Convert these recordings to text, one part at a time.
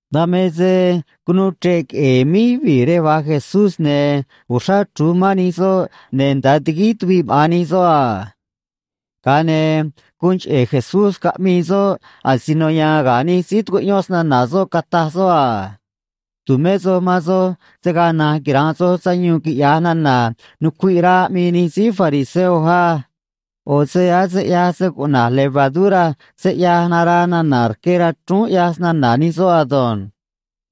Dan me se cunuu chre̱ꞌ queꞌe̱e̱ míj yuvii̱ rej va̱j Jesús, ne̱ uxrá chru̱j mán nij soꞌ, ne̱ nda̱a tiguíj tuviꞌ maꞌa̱n nij soꞌ a. Ga̱a ne̱ guun cheꞌe̱ Jesús caꞌmii soꞌ asino ya̱a̱n ga̱ nij síí tucuꞌyón snana̱ soꞌ, cataj soꞌ a: ―Tu̱mé soj man soj se̱ gaa na̱nj quira̱nꞌ soj sayuun, quiꞌya̱j nana̱ nucuiꞌ rá aꞌmii nij síí fariseo á. ꞌO̱ se ase ꞌyaj se cuꞌna̱j levadura se ꞌyaj naraa nana̱ rque rachrúún ꞌyaj snana̱ nij soꞌ ado̱nj.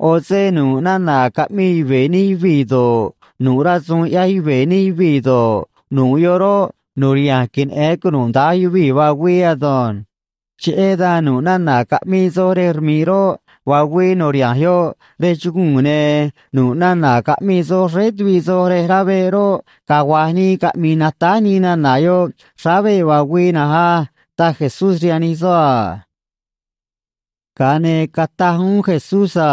ꞌO̱ se nu̱ꞌ nana̱ caꞌmii yuve̱ nij yuvii̱ do̱ꞌ, nu̱ꞌ rasu̱u̱n ꞌyaj yuve̱ nij yuvii̱ do̱ꞌ, nu̱ꞌ yoꞌ roꞌ, nu̱riha̱nj queneꞌe̱n cunuda̱nj yuvii̱ vaa güii ado̱nj. Cheꞌé dan nu̱ꞌ nana̱ caꞌmii soj rej rmi̱ꞌ roꞌ, vaa güii nu̱riha̱nj yoꞌ rej chuguu̱n, ne̱ nu̱ꞌ nana̱ caꞌmii soj xréé tuviꞌ soj rej rá veꞌ roꞌ, cagua̱j nii caꞌmi̱i̱ natáj nii nana̱ yoꞌ xráá veꞌ vaa güii na̱nj á ―taj Jesús rihaan nij soꞌ a. Ga̱a ne̱ cataj uún Jesús a: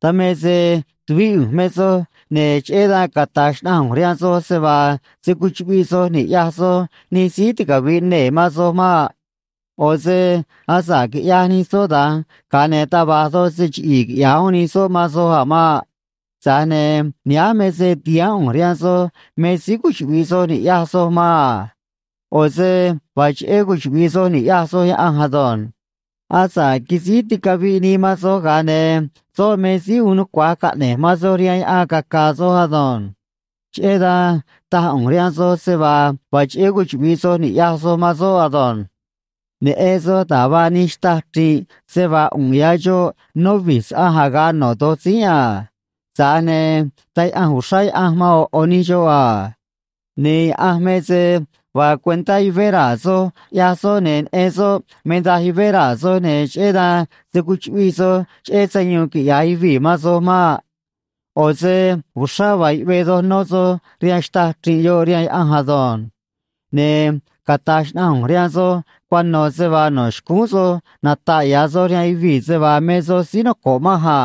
―Dan me se tuvíꞌ ꞌu̱nj me soj, ne̱ cheꞌé dan cata̱j xnaꞌanj ꞌu̱nj rihaan soj se vaa se̱ cuchuꞌviꞌ soj ni̱ꞌyaj soj nij síí ticavi̱ꞌ nee̱ man soj maꞌ. ꞌO̱ se asa̱ꞌ quiꞌyaj nij soꞌ da̱nj, ga̱a ne̱ taj va̱j doj se chiꞌi̱i̱ quiꞌya̱j uún nij soꞌ man soj a̱ maꞌ. Tza̱j ne̱ nihánj me se ti̱haán ꞌu̱nj rihaan soj me síí cuchuꞌvi̱ꞌ soj ni̱ꞌyaj soj man a. ꞌO̱ se vaa cheꞌé cuchuꞌvi̱ꞌ soj ni̱ꞌyaj soj Yaꞌanj ado̱nj. Asa̱ꞌ quisíj ticaviꞌ nii man soj, ga̱a ne̱ soꞌ me síí uun nucua̱j caꞌne̱j man soj rihaan yaꞌan caca̱a̱ soj ado̱nj. Cheꞌé dan taj ꞌu̱nj rihaan soj se vaa vaa cheꞌé cuchuꞌvi̱ꞌ soj ni̱ꞌyaj soj man soꞌ ado̱nj. ’Neꞌen soj da̱j vaa nij xtâj chri̱nꞌ se vaa ꞌu̱nꞌ ya̱ xoꞌ nó vi̱j saꞌanj aga̱ꞌ no̱ do̱j tzínꞌ a. Tza̱j ne̱ taj yaꞌanj uxrá Yaꞌanj man ꞌo̱ ꞌo̱ nij xoꞌ a. Ne̱ Yaꞌanj me se vaa cuentá yuvé raa̱ soj ꞌyaj soꞌ, ne̱ neꞌen soꞌ me daj yuvé raa̱ soj, ne̱ cheꞌé dan se̱ cuchuꞌviꞌ soj cheꞌé sayuun quiꞌya̱j yuvii̱ man soj maꞌ. ꞌO̱ se uxrá vaa yuꞌvee doj nó soj rihaan xtâj chri̱nꞌ yoꞌ, rihaan Yaꞌanj ado̱nj. ’Ne̱ cata̱j xnaꞌanj ꞌu̱nj rihaan soj cuano̱ se vaa no̱ xcúún soj nata̱ꞌ ya̱ soj rihaan yuvii̱ se vaa me soj síí noco̱ꞌ manj a.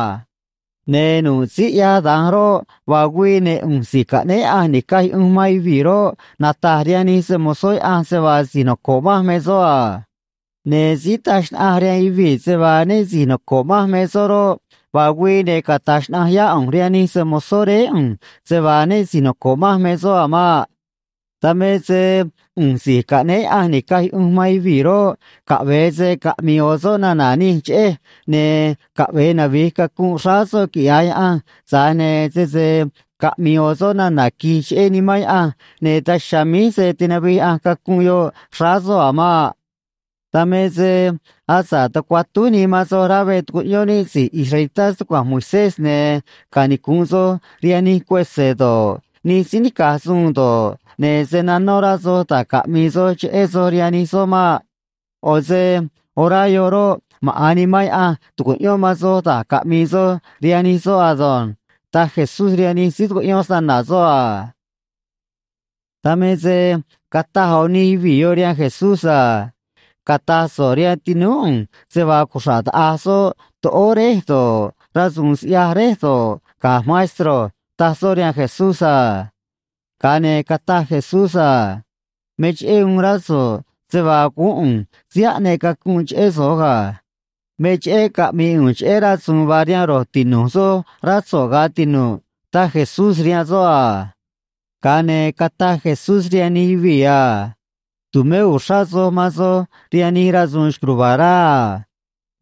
Ne̱ nu̱ꞌ síí ꞌyaj da̱nj roꞌ, vaa güii, ne̱ ꞌu̱nj Si̱j Caꞌnéé Yaꞌanj Ni̱caj Yuꞌunj man Yuvii̱ roꞌ, nata̱j rihaan nij se‑mo̱zó Yaꞌanj se vaa si̱j noco̱ꞌ manj me soꞌ a. Ne̱ síí taj xnaꞌanj rihaan yuvii̱ se vaa né si̱j noco̱ꞌ manj me soꞌ roꞌ, vaa güii, ne̱ cata̱j xnaꞌanj yá ꞌu̱nj rihaan nij se‑mo̱zó Réé ꞌu̱nj se vaa né si̱j noco̱ꞌ manj me soꞌ a̱ maꞌ. ’Dan me se ꞌu̱nj Si̱j Caꞌnéé Yaꞌanj Ni̱caj Yuꞌunj man Yuvii̱ roꞌ, caꞌve̱e se caꞌmi̱i̱ ꞌo̱ soꞌ nana̱ nij cheꞌej, ne̱ caꞌve̱e navi̱j cacunꞌ xráá soꞌ quiꞌya̱j Yaꞌanj, tza̱j ne̱ sese caꞌmi̱i̱ ꞌo̱ soꞌ nana̱ qui̱j cheꞌé Nimán Yaꞌanj, ne̱ daj chiha̱a̱ míj se̱ tinavij Yaꞌanj cacunꞌ yoꞌ xráá soꞌ a̱ maꞌ. ’Dan me se asa̱ꞌ tucuatúj nii man soj rá veꞌ tucuꞌyón níꞌ si̱j israelitá stucua̱nj Moisés ne̱ canicu̱nꞌ soj rihaan nij cuese̱ do̱ꞌ, nij síí nica̱j suun do̱ꞌ, ne̱ se̱ nanó rá soj da̱j caꞌmi̱i̱ soj cheꞌé soj rihaan nij soꞌ maꞌ. ꞌO̱ se orá yoꞌ roꞌ, maꞌa̱n Nimán Yaꞌanj tu̱cuꞌyón man soj da̱j caꞌmi̱i̱ soj rihaan nij soꞌ ado̱nj ―taj Jesús rihaan nij síí tucuꞌyón snana̱ soꞌ a. Dan me se cataj ꞌo̱ nij yuvii̱ yoꞌ rihaan Jesús a: ―Cata̱j so̱ꞌ rihaan tinúú ꞌu̱nj se vaa cuxra̱ꞌ taꞌa̱j soꞌ toꞌóó réj do̱ꞌ, rasu̱u̱n siꞌya̱j réj do̱ꞌ, ga̱j, maestro ―taj soꞌ rihaan Jesús a. Ga̱a ne̱ cataj Jesús a: ―Me cheꞌé uun rá so̱ꞌ se vaa guún ꞌu̱nj síí aꞌneꞌ cacunꞌ cheꞌé soj ga̱. Me cheꞌé caꞌmi̱i̱ ꞌu̱nj cheꞌé rasu̱u̱n vaa rihaan ro̱j tinu̱j soj, rá so̱ꞌ, ga̱ tinu̱ꞌ ―taj Jesús rihaan soꞌ a. Ga̱a ne̱ cataj Jesús rihaan nij yuvii̱ a: ―Tu̱mé uxrá soj man soj rihaan nij rasu̱u̱n xco̱j ruva̱a̱ rá a.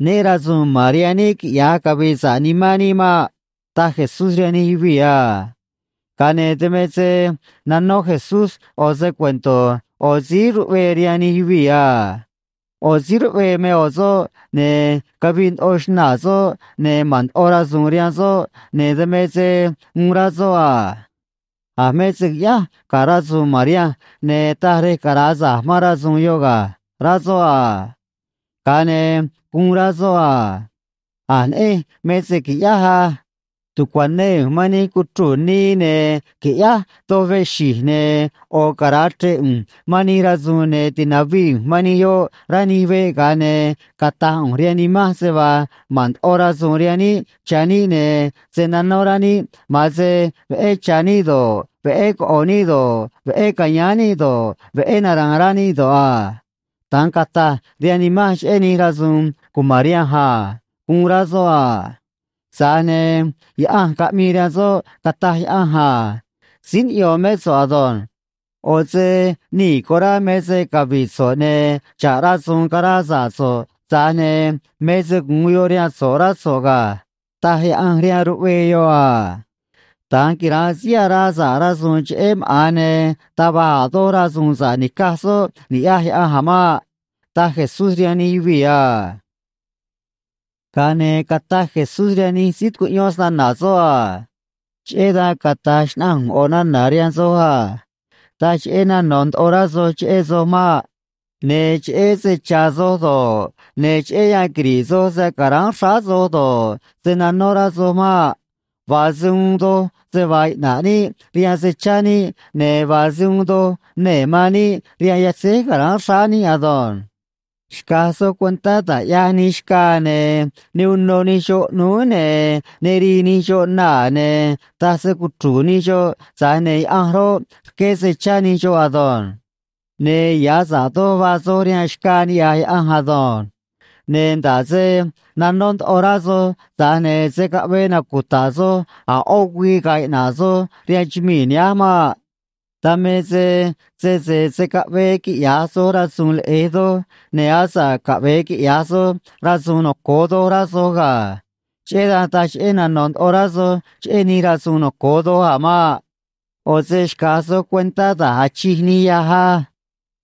Né ra̱su̱u̱n ma̱n rihaan níꞌ quiꞌya̱j cavi̱i̱ sa̱ꞌ nimán níꞌ maꞌ ―taj Jesús rihaan nij yuvii̱ a. Ga̱a ne̱ dan me se nanó Jesús ꞌo̱ se‑cuento̱ ꞌo̱ síí ruꞌvee rihaan nij yuvii̱ a: ―ꞌO̱ síí ruꞌvee me ꞌo̱ soꞌ, ne̱ cavii ndoꞌo xnaa̱ soꞌ, ne̱ ma̱n ndoꞌo rasu̱u̱n rihaan soꞌ, ne̱ dan me se uun rá soꞌ a: “A̱ me se qui̱ꞌyáj ga̱ rasu̱u̱n ma̱n rihanj ne̱ taj rej cara̱a sa̱j man rasu̱u̱n yoꞌ ga̱”, rá soꞌ a. Ga̱a ne̱ guun rá soꞌ a: “A̱j neꞌenj me se qui̱ꞌyáj á. Tu̱cuanee ꞌu̱nj man nij cuchruu̱ nii, ne̱ qui̱ꞌyáj doj veꞌ xi̱j, ne̱ ꞌo̱ cara̱a chre̱ꞌ ꞌu̱nj man nij rasu̱u̱n, ne̱ ti̱navii ꞌu̱nj man nij yoꞌ rá nij veꞌ, ga̱a ne̱ cata̱j ꞌu̱nj rihaan nimanj se vaa ma̱n ndoꞌo rasu̱u̱n rihaan níꞌ cha̱ níꞌ, ne̱ se̱ nanó rá níꞌ, ma̱an se veꞌé cha̱ níꞌ do̱ꞌ, veꞌé coꞌo̱ níꞌ do̱ꞌ, veꞌé ca̱yáán níꞌ do̱ꞌ, veꞌé nara̱a̱n rá níꞌ do̱ꞌ a. Da̱nj cata̱j rihaan nimanj cheꞌé nij rasu̱u̱n cuma̱n rihanj a”, guun rá soꞌ a. Tza̱j ne̱ Yaꞌanj caꞌmii rihaan soꞌ, cataj Yaꞌanj a: “Síí niꞌyo̱n mé so̱ꞌ ado̱nj. ꞌO̱ se nii̱ corá me se cavi̱ꞌ so̱ꞌ, ne̱ xa̱ꞌ rasu̱u̱n caraa sa̱ꞌ so̱ꞌ, tza̱j ne̱ me se gu̱un yoꞌ rihaan so̱ꞌ, rá so̱ꞌ ga̱”, taj Yaꞌanj rihaan ruꞌvee yoꞌ a. Da̱nj quira̱nꞌ síí araa sa̱ꞌ rasu̱u̱n cheꞌé maꞌa̱n, ne̱ taj va̱j a̱ doj rasu̱u̱n sa̱ꞌ nica̱j soꞌ, niꞌya̱j Yaꞌanj a̱ maꞌ ―taj Jesús rihaan nij yuvii̱ a. Ga̱a ne̱ cataj Jesús rihaan nij síí tucuꞌyón snana̱ soꞌ a: ―Cheꞌé dan cata̱j xnaꞌanj ꞌu̱nj ꞌo̱ nana̱ rihaan soj a: Taj cheꞌé nano̱ ndoꞌo rá soj cheꞌé soj maꞌ. Ne̱ cheꞌé se cha̱ soj do̱ꞌ, ne̱ cheꞌé yan quiri̱ꞌ soj se ca̱ráán xráá soj do̱ꞌ, se̱ nanó rá soj maꞌ. Vaa se uun doj se vaa iꞌna̱ꞌ níꞌ rihaan se cha̱ níꞌ, ne̱ vaa se uun doj nee̱ man níꞌ rihaan yatzéj ca̱ráán xráá níꞌ ado̱nj. ’Xca̱j soj cuentá da̱j ꞌyaj nij xcaa, ne̱ ne unô nij xoꞌ ꞌnúú, ne̱ ne rii nij xoꞌ naa̱, ne̱ taj se‑cuchru̱u̱ nij xoꞌ, tza̱j ne̱ Yaꞌanj roꞌ, rqué se chá nij xoꞌ ado̱nj. Ne̱ ya̱ sa̱ꞌ doj vaa soj rihaan xcaa niꞌya̱j Yaꞌanj ado̱nj. Ne̱ nda̱ꞌ se nanó ndoꞌo rá soj, tza̱j ne̱ se̱ caꞌvee nacuta̱ꞌ soj a̱ ꞌó güii ga̱a̱ iꞌna̱ꞌ soj rihaan chumii̱ nihánj maꞌ. Dan me se sese se̱ caꞌvee quiꞌya̱j soj rasu̱u̱n leꞌe̱j doj, ne̱ asa̱ꞌ caꞌve̱e quiꞌya̱j soj rasu̱u̱n noco̱o doj, rá soj ga̱. Cheꞌé dan taj cheꞌé nano̱ ndoꞌo rá soj cheꞌé nij rasu̱u̱n noco̱o doj a̱ maꞌ. ’ ꞌO̱ se xca̱j soj cuentá da̱j achij nij yâj á.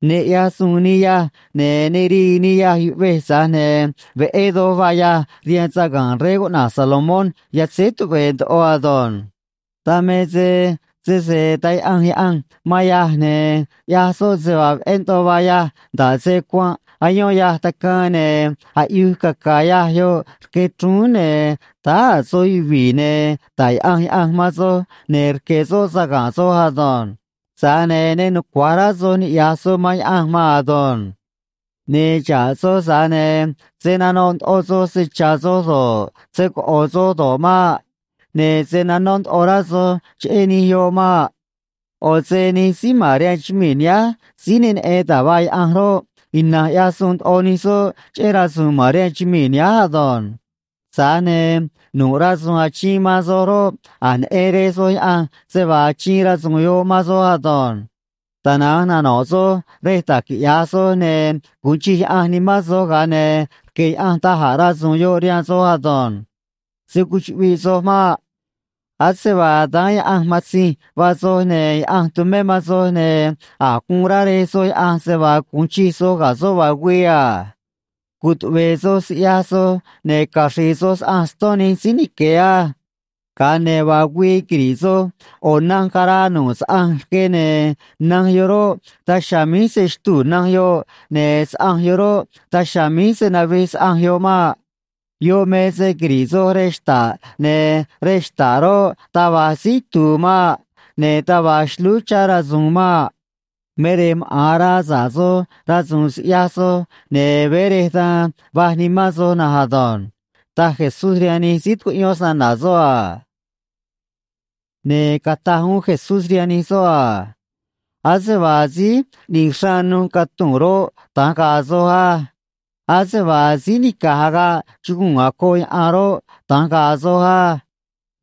Ne ꞌyaj suun nij yâj, ne̱ ne rii nij yâj yuꞌvej, tza̱j ne̱ veꞌé doj vaa yâj rihaan saga̱nꞌ rey cuꞌna̱j Salomón yatzéj tuꞌve̱e̱ ndoꞌo ado̱nj. Dan me se sese taj yaꞌanj Yaꞌanj man yâj, ne̱ ꞌyaj soꞌ se vaa veꞌé ndoꞌo vaa yâj, nda̱ꞌ se cuanꞌ ayón yâj tacaan ne̱ aꞌyuj caca̱a̱ yâj yoꞌ rque chrúún, ne̱ táá a̱ soj yuvi̱i̱, ne̱ ta̱j yaꞌanj Yaꞌanj man soj ne̱ rque̱ soꞌ saga̱nꞌ soj ado̱nj. Tza̱j ne̱ ne nucua̱j rá soj niꞌya̱j soj man Yaꞌanj maan ado̱nj. ’Ne̱ xa̱ꞌ soj, tza̱j ne̱ se̱ nanoꞌ ndoꞌo soj se cha̱ soj do̱ꞌ, se coꞌo̱ soj do̱ꞌ maꞌ. Ne̱ se̱ nanó ndoꞌo rá soj cheꞌé nij yoꞌ maꞌ. ꞌO̱ se nij síí ma̱n rihaan chumii̱ nihánj síí ne neꞌen da̱j vaa Yaꞌanj roꞌ, ina̱nj ꞌyaj suun ndoꞌo nij soꞌ cheꞌé rasu̱u̱n ma̱n rihaan chumii̱ nihánj ado̱nj. Tza̱j ne̱ nu̱ꞌ rasu̱u̱n achiin man soj roꞌ, a̱j neꞌen Rej soj Yaꞌanj se vaa achiin rasu̱u̱n yoꞌ man soj ado̱nj. Tana̱nj nano̱ꞌ soj rej da̱j quiꞌya̱j soj, ne̱ gu̱un chij Yaꞌanj nimán soj, ga̱a ne̱ rque̱ Yaꞌanj da̱j a̱ rasu̱u̱n yoꞌ rihaan soj ado̱nj. ’Se̱ cuchuꞌviꞌ soj maꞌ. Ase vaa daán Yaꞌanj matzinj vaa soj, ne̱ Yaꞌanj tumé man soj, ne̱ a̱j guun rá Rej soj Yaꞌanj se vaa gu̱un chij soj ga̱ soꞌ vaa güii a. ’Cutuꞌve̱e̱ soj siꞌyaj soj, ne̱ caxri̱i̱ soj saꞌanj ston nij síí nique̱ á. Ga̱a ne̱ vaa güii quiri̱ꞌ soj ꞌo̱ nanj caraa nu̱ꞌ saꞌanj rque, ne̱ nanj yoꞌ roꞌ, daj chiha̱a̱ míj se̱ xtuu̱ nanj yoꞌ, ne̱ saꞌanj yoꞌ roꞌ, daj chiha̱a̱ míj se̱ navij saꞌanj yoꞌ maꞌ. Yoꞌ me se quiri̱ꞌ soj rej xta̱ꞌ, ne̱ rej xta̱ꞌ roꞌ, taj va̱j síí itu̱u̱ maꞌ. Ne̱ taj va̱j xlúú chá rasu̱u̱n maꞌ. Me rej maꞌa̱n araa sa̱ꞌ soj rasu̱u̱n siꞌyaj soj, ne̱ veé rej da̱nj vaj nimán soj na̱nj ado̱nj ―taj Jesús rihaan nij síí tucuꞌyón snana̱ soꞌ a. Ne̱ cataj uún Jesús rihaan nij soꞌ a: ―Ase vaa síí ꞌni̱j xraan nuj catuu̱n roꞌ, da̱nj ga̱a̱ soj á. Ase vaa síí nica̱j agaꞌ chuguu̱n acoꞌ yaꞌan roꞌ, da̱nj ga̱a̱ soj á.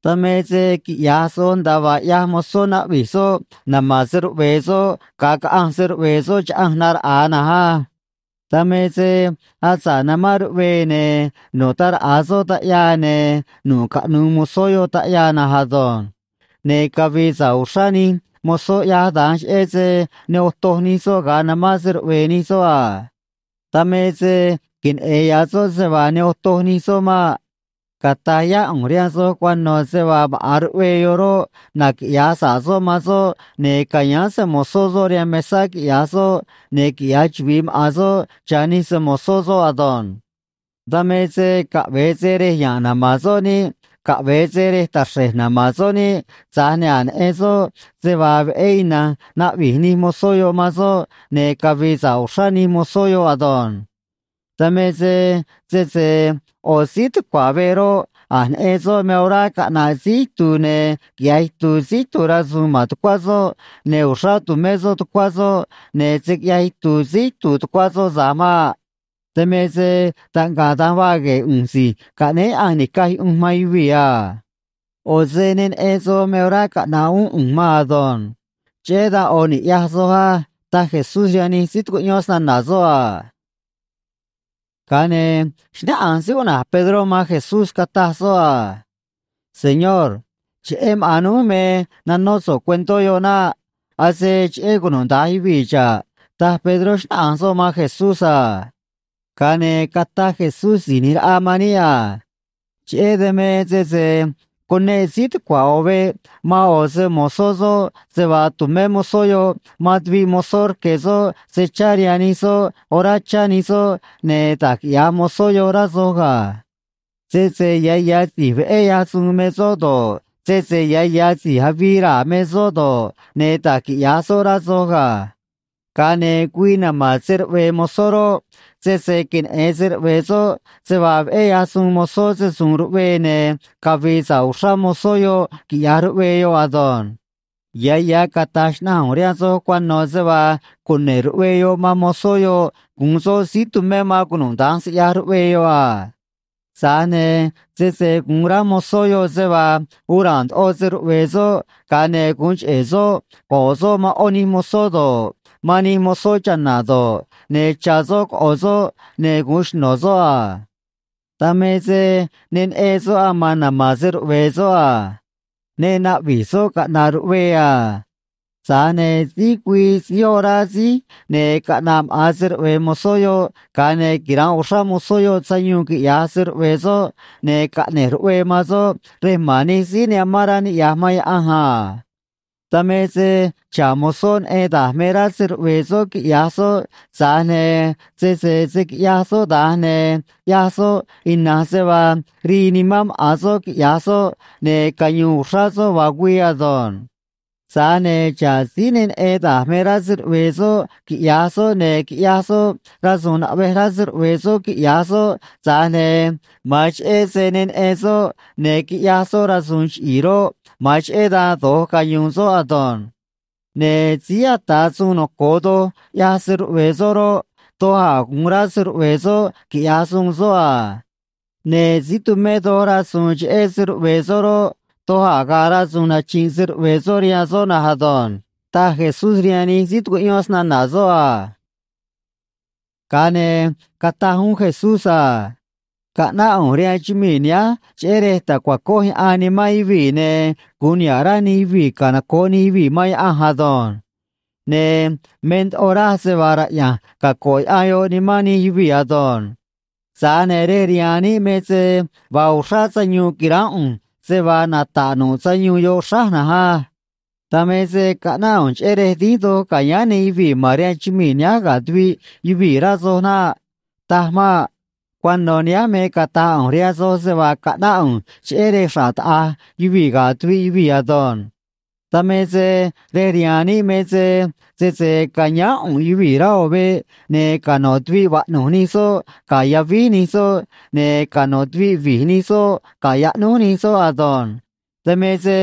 Dan me se quiꞌya̱j soj nda̱a vaa ꞌyaj mozó naꞌvi̱j soꞌ nama̱n se‑ruꞌve̱e̱ soꞌ ga̱a caꞌanj se‑ruꞌve̱e̱ soꞌ chaꞌanj naraꞌa̱a na̱nj á. Dan me se asa̱ꞌ namán ruꞌvee ne̱ nu̱ꞌ ta̱raꞌa soꞌ taꞌyaa, ne̱ nu̱ꞌ caꞌnu̱u̱ mozó yoꞌ taꞌyaa na̱nj ado̱nj. Ne̱ cavi̱i̱ sa̱ꞌ uxrá nij mozó ꞌyaj da̱nj, cheꞌé se ne otoj nij soꞌ ga̱a namán se‑ruꞌve̱e̱ nij soꞌ a. Dan me se queneꞌe̱n ya̱ soꞌ se vaa ne otoj nij soꞌ maꞌ. Cata̱j yá ꞌu̱nj rihaan soj cuano̱ se vaa maꞌa̱n ruꞌvee yoꞌ roꞌ, naquiꞌya̱j sa̱ꞌ soꞌ man soꞌ, ne̱ ca̱yáán se‑mo̱zó soꞌ rihaan mesá, quiꞌya̱j soꞌ, ne̱ quiꞌya̱j chuvi̱i maꞌa̱n soꞌ cha̱ nij se‑mo̱zó soꞌ ado̱nj. Dan me se caꞌve̱e se rej ya̱nꞌ nama̱n soꞌ niꞌ, caꞌve̱e se rej taxre̱j nama̱n soꞌ niꞌ, tza̱j ne̱ a̱j neꞌen soꞌ se vaa veꞌé ina̱nj naꞌvi̱j nij mozó yoꞌ man soꞌ, ne̱ cavi̱i̱ sa̱ꞌ uxrá nij mozó yoꞌ ado̱nj. Dan me se sese ꞌo̱ síí tucua̱ veꞌ roꞌ, a̱j neꞌen soꞌ me orá caꞌna̱ꞌ síí itu̱u̱ ne̱ quiꞌya̱j itu̱u̱ síí itu̱u̱ rasu̱u̱n ma̱n tucuá soꞌ, ne̱ uxrá tu̱mé soꞌ tucuá soꞌ, ne̱ se̱ quiꞌyaj itu̱u̱ síí itu̱u̱ tucuá soꞌ tza̱j maꞌ. Dan me se taꞌngaꞌ da̱nj vaa gue̱e̱ ꞌu̱nj Si̱j Caꞌnéé Yaꞌanj Ni̱caj Yuꞌunj man Yuvii̱ a. ꞌO̱ se ne neꞌen soj me orá caꞌna̱ꞌ uún ꞌu̱nj maan ado̱nj. Cheꞌé dan ꞌo̱ ni̱ꞌyaj soj á ―taj Jesús rihaan nij síí tucuꞌyón snana̱ soꞌ a. Ga̱a ne̱ xnáꞌanj síí cuꞌna̱j Pedró man Jesús, cataj soꞌ a: ―Señor, cheꞌé maꞌa̱n núj me nanó so̱ꞌ cuentó yoꞌ naꞌ. Ase cheꞌé cunuda̱nj yuvii̱ xa̱ꞌ ―taj Pedró, xnáꞌanj soꞌ man Jesús a. Ga̱a ne̱ cataj Jesús Si̱j ꞌNi̱j Raꞌa man níꞌ a: ―Cheꞌé dan me sese cuneꞌ síí tucua̱ ꞌo̱ veꞌ man ꞌo̱ se‑mo̱zó soꞌ se vaa tu̱mé mozó yoꞌ man tuviꞌ mozó rque̱ soꞌ se chá rihaan nij soꞌ orá chá nij soꞌ, ne̱ da̱j quiꞌya̱j mozó yoꞌ, rá soj ga̱. Sese ya̱ ya̱ si̱j veꞌé ꞌyaj suun me soꞌ do̱ꞌ, sese ya̱ ya̱ si̱j avii raa̱ me soꞌ do̱ꞌ, ne̱ da̱j quiꞌya̱j soꞌ, rá soj ga̱. Ga̱a ne̱ güii nama̱n se‑ruꞌve̱e̱ mozó roꞌ, sese queneꞌe̱n se‑ruꞌve̱e̱ soꞌ se vaa veꞌé ꞌyaj suun mozó se‑su̱u̱n ruꞌvee, ne̱ cavi̱i̱ sa̱ꞌ uxrá mozó yoꞌ, quiꞌya̱j ruꞌvee yoꞌ ado̱nj. Ya̱ ya̱ cata̱j xnaꞌanj ꞌu̱nj rihaan soj cuano̱ se vaa cune̱ꞌ ruꞌvee yoꞌ man mozó yoꞌ gu̱un soꞌ síí tumé man cunuda̱nj siꞌyaj ruꞌvee yoꞌ a. Tza̱j ne̱ sese gu̱un rá mozó yoꞌ se vaa uun ra̱a̱n ndoꞌo se‑ruꞌve̱e̱ soꞌ, ga̱a ne̱ gu̱un cheꞌe̱ soꞌ go̱ꞌ soꞌ man ꞌó nij mozó do̱ꞌ, man nij mozó cha̱na̱ do̱ꞌ, ne̱ cha̱ soꞌ coꞌo̱ soꞌ ne̱ gu̱un xno̱ soꞌ a. Dan me se ne neꞌen soꞌ aman nama̱n se‑ruꞌve̱e̱ soꞌ a. Ne naꞌvi̱j soꞌ caꞌna̱ꞌ ruꞌvee a. Tza̱j ne̱ síj güii síj orá síj, ne̱ caꞌna̱ꞌ maꞌa̱n se‑ruꞌve̱e̱ mozó yoꞌ, ga̱a ne̱ quira̱nꞌ uxrá mozó yoꞌ sayuun, quiꞌya̱j se‑ruꞌve̱e̱ soꞌ, ne̱ caꞌne̱j ruꞌvee man soꞌ rej ma̱n nij síí ne amán rá niꞌya̱j man Yaꞌanj a. ’Dan me se xa̱ꞌ mozó neꞌen da̱j me rá se‑ruꞌve̱e̱ soꞌ quiꞌya̱j soꞌ, tza̱j ne̱ sese se̱ quiꞌyaj soꞌ da̱nj, ne̱ ꞌyaj soꞌ ina̱nj se vaa rii nimán maꞌa̱n soꞌ quiꞌya̱j soꞌ, ne̱ cayu̱u̱n uxrá soꞌ vaa güii ado̱nj. Tza̱j ne̱ xa̱ꞌ síí ne neꞌen da̱j me rá se‑ruꞌve̱e̱ soꞌ quiꞌya̱j soꞌ, ne̱ quiꞌyaj soꞌ rasu̱u̱n naꞌvej rá se‑ruꞌve̱e̱ soꞌ quiꞌya̱j soꞌ, tza̱j ne̱ ma̱an cheꞌé se ne neꞌen soꞌ ne̱ quiꞌyaj soꞌ rasu̱u̱n chiꞌi̱i̱ roꞌ, ma̱an cheꞌé dan do̱j cayu̱u̱n soꞌ ado̱nj. ’Ne̱ síí ata̱ suun noco̱o doj ꞌyaj se‑ruꞌve̱e̱ soꞌ roꞌ, doj a̱ gu̱un rá se‑ruꞌve̱e̱ soꞌ quiꞌya̱j suun soꞌ a. Ne̱ síí tumé doj rasu̱u̱n cheꞌé se‑ruꞌve̱e̱ soꞌ roꞌ, doj a̱ ga̱a̱ rasu̱u̱n nachi̱nꞌ se‑ruꞌve̱e̱ soꞌ rihaan soꞌ na̱nj ado̱nj ―taj Jesús rihaan nij síí tucuꞌyón snana̱ soꞌ a. Ga̱a ne̱ cataj uún Jesús a: ―Caꞌnáꞌ ꞌu̱nj rihaan chumii̱ nihánj cheꞌé rej ta̱cuacoj yaꞌan nimán yuvii̱, ne̱ gu̱un niha̱ꞌ rá nij yuvii̱ canoco̱ꞌ nij yuvii̱ man Yaꞌanj ado̱nj. Ne̱ me ndoꞌo raj se vaa raꞌya̱nj caco̱ꞌ yaꞌan yoꞌ nimán nij yuvii̱ ado̱nj. Tza̱j ne̱ rej rihaan níꞌ me se vaa uxrá sayuun qui̱ránꞌ ꞌu̱nj, se vaa nata̱ꞌ nu̱ꞌ sayuun yoꞌ xráj na̱nj á. Dan me se caꞌnáꞌ ꞌu̱nj cheꞌé rej dínj doj ca̱yáán nij yuvii̱ ma̱n rihaan chumii̱ nihánj ga̱ tuviꞌ yuvii̱, rá soj naꞌ. Taj maꞌ. Cuano̱ nihánj me cata̱j ꞌu̱nj rihaan soj se vaa caꞌnáꞌ ꞌu̱nj cheꞌé rej xra̱ꞌ taꞌa̱j yuvii̱ ga̱ tuviꞌ yuvii̱ ado̱nj. Dan me se rej rihaan níꞌ me se, sese ca̱yáán ꞌu̱nꞌ yuvii̱ rá ꞌo̱ veꞌ, ne̱ cano̱ tuviꞌ vaꞌnu̱j nij soꞌ ga̱ yavíj nij soꞌ, ne̱ cano̱ tuviꞌ vi̱j nij soꞌ ga̱ yaꞌnúj nij soꞌ ado̱nj. Dan me se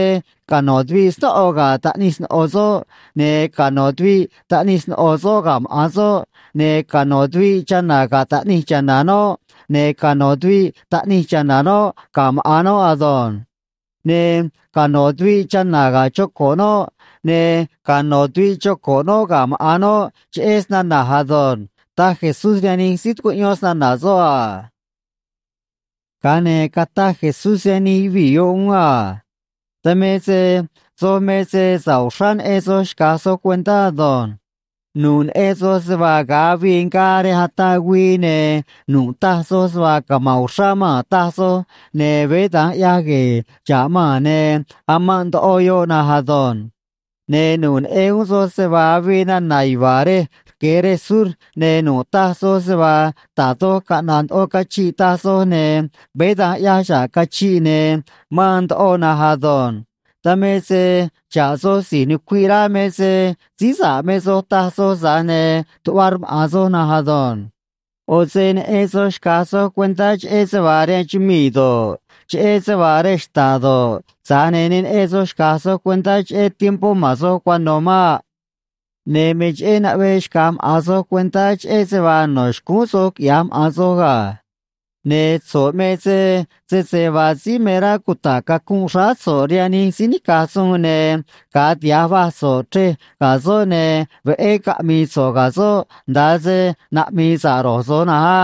cano̱ tuviꞌ snóꞌo ga̱ taꞌnij sno̱ꞌo soꞌ, ne̱ cano̱ tuviꞌ taꞌnij sno̱ꞌo soꞌ ga̱ maꞌa̱n soꞌ, ne̱ cano̱ tuviꞌ chana̱ ga̱ taꞌnij cha̱na̱ noꞌ, ne̱ cano̱ tuviꞌ taꞌnij cha̱na̱ noꞌ ga̱ maꞌa̱n noꞌ ado̱nj. Ne̱ cano̱ tuviꞌ chana̱ ga̱ choco̱ꞌ noꞌ, ne̱ cano̱ tuviꞌ choco̱ꞌ noꞌ ga̱ maꞌa̱n noꞌ, cheꞌé snana̱j ado̱nj ―taj Jesús rihaan nij síí tucuꞌyón snana̱ soꞌ a. Ga̱a ne̱ cataj Jesús rihaan nij yuvii̱ yoꞌ uún a: ―Dan me se soj me se sa̱ꞌ uxrá neꞌen soj xca̱j soj cuentá ado̱nj. Nu̱ꞌ neꞌen soj se vaa ga̱a avii ngaa rej ataꞌ güii, ne̱ nu̱ꞌ taj soj se vaa cama̱nꞌ uxrá maa̱n, taj soj, ne̱ veé da̱nj ꞌyaj gue̱e̱ xa̱ꞌ maa̱n, ne̱ amanꞌ ndoꞌo yoꞌ na̱nj ado̱nj. Ne̱ nu̱ꞌ neꞌen uún soj se vaa avii nana̱ yuva̱a̱ rej rque̱ rej sur, ne̱ nu̱ꞌ taj soj se vaa da̱j doj caꞌna̱ꞌ ndoꞌo cachiꞌ taj soj, ne̱ veé da̱nj ꞌyaj xa̱ꞌ cachiꞌ, ne̱ maan ndoꞌo na̱nj ado̱nj. Dan me se xa̱ꞌ soj si̱j nucuiꞌ rá me se síí sa̱ꞌ me soj taj soj, tza̱j ne̱ tuꞌva rmaꞌa̱n soj na̱nj ado̱nj. ꞌO̱ se neꞌen soj xca̱j soj cuentá cheꞌé se vaa rihaan chumii̱ do̱ꞌ, cheꞌé se vaa rej xta̱ꞌ do̱ꞌ, tza̱j ne̱ ne neꞌen soj xca̱j soj cuentá cheꞌé tiempó ma̱n soj cuano̱ maꞌ. ’Ne̱ me cheꞌé naꞌvee xca̱j maꞌa̱n soj cuentá cheꞌé se vaa no̱ xcúún soj quiꞌya̱j maꞌa̱n soj ga̱. Ne̱ so̱ꞌ me se sese vaa síí me rá cuta̱ꞌ cacunꞌ xráá so̱ꞌ rihaan nij síí nica̱j suun, ne̱ ga̱a tiha̱j vaj so̱ꞌ chrej ga̱ soꞌ, ne̱ veꞌé caꞌmi̱i̱ so̱ꞌ ga̱ soꞌ, nda̱a se naꞌmi̱i̱ sa̱ꞌ ro̱j so̱j na̱nj á.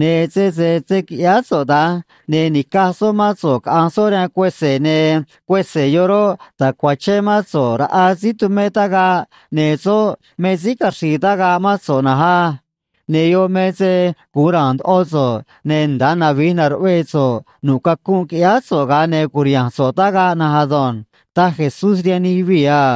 Ne̱ sese se̱ quiꞌyáá so̱ꞌ da̱nj, ne̱ ni̱caj soꞌ mán so̱ꞌ caꞌa̱nj soꞌ rihaan cuese̱, ne̱ cuese̱ yoꞌ roꞌ, ta̱cuachén mán so̱ꞌ raꞌa síí tumé tagaꞌ, ne̱ soꞌ me síí caxri̱i̱ tagaꞌ mán so̱ꞌ na̱nj á. Ne̱ yoꞌ me se gu̱un ra̱a̱n ndoꞌo so̱ꞌ, ne̱ nda̱a navij na̱ruꞌvee so̱ꞌ nu̱ꞌ cacunꞌ quiꞌyáá so̱ꞌ, ga̱a ne̱ cu̱riha̱nj so̱ꞌ tagaꞌ na̱nj ado̱nj ―taj Jesús rihaan nij yuvii̱ a.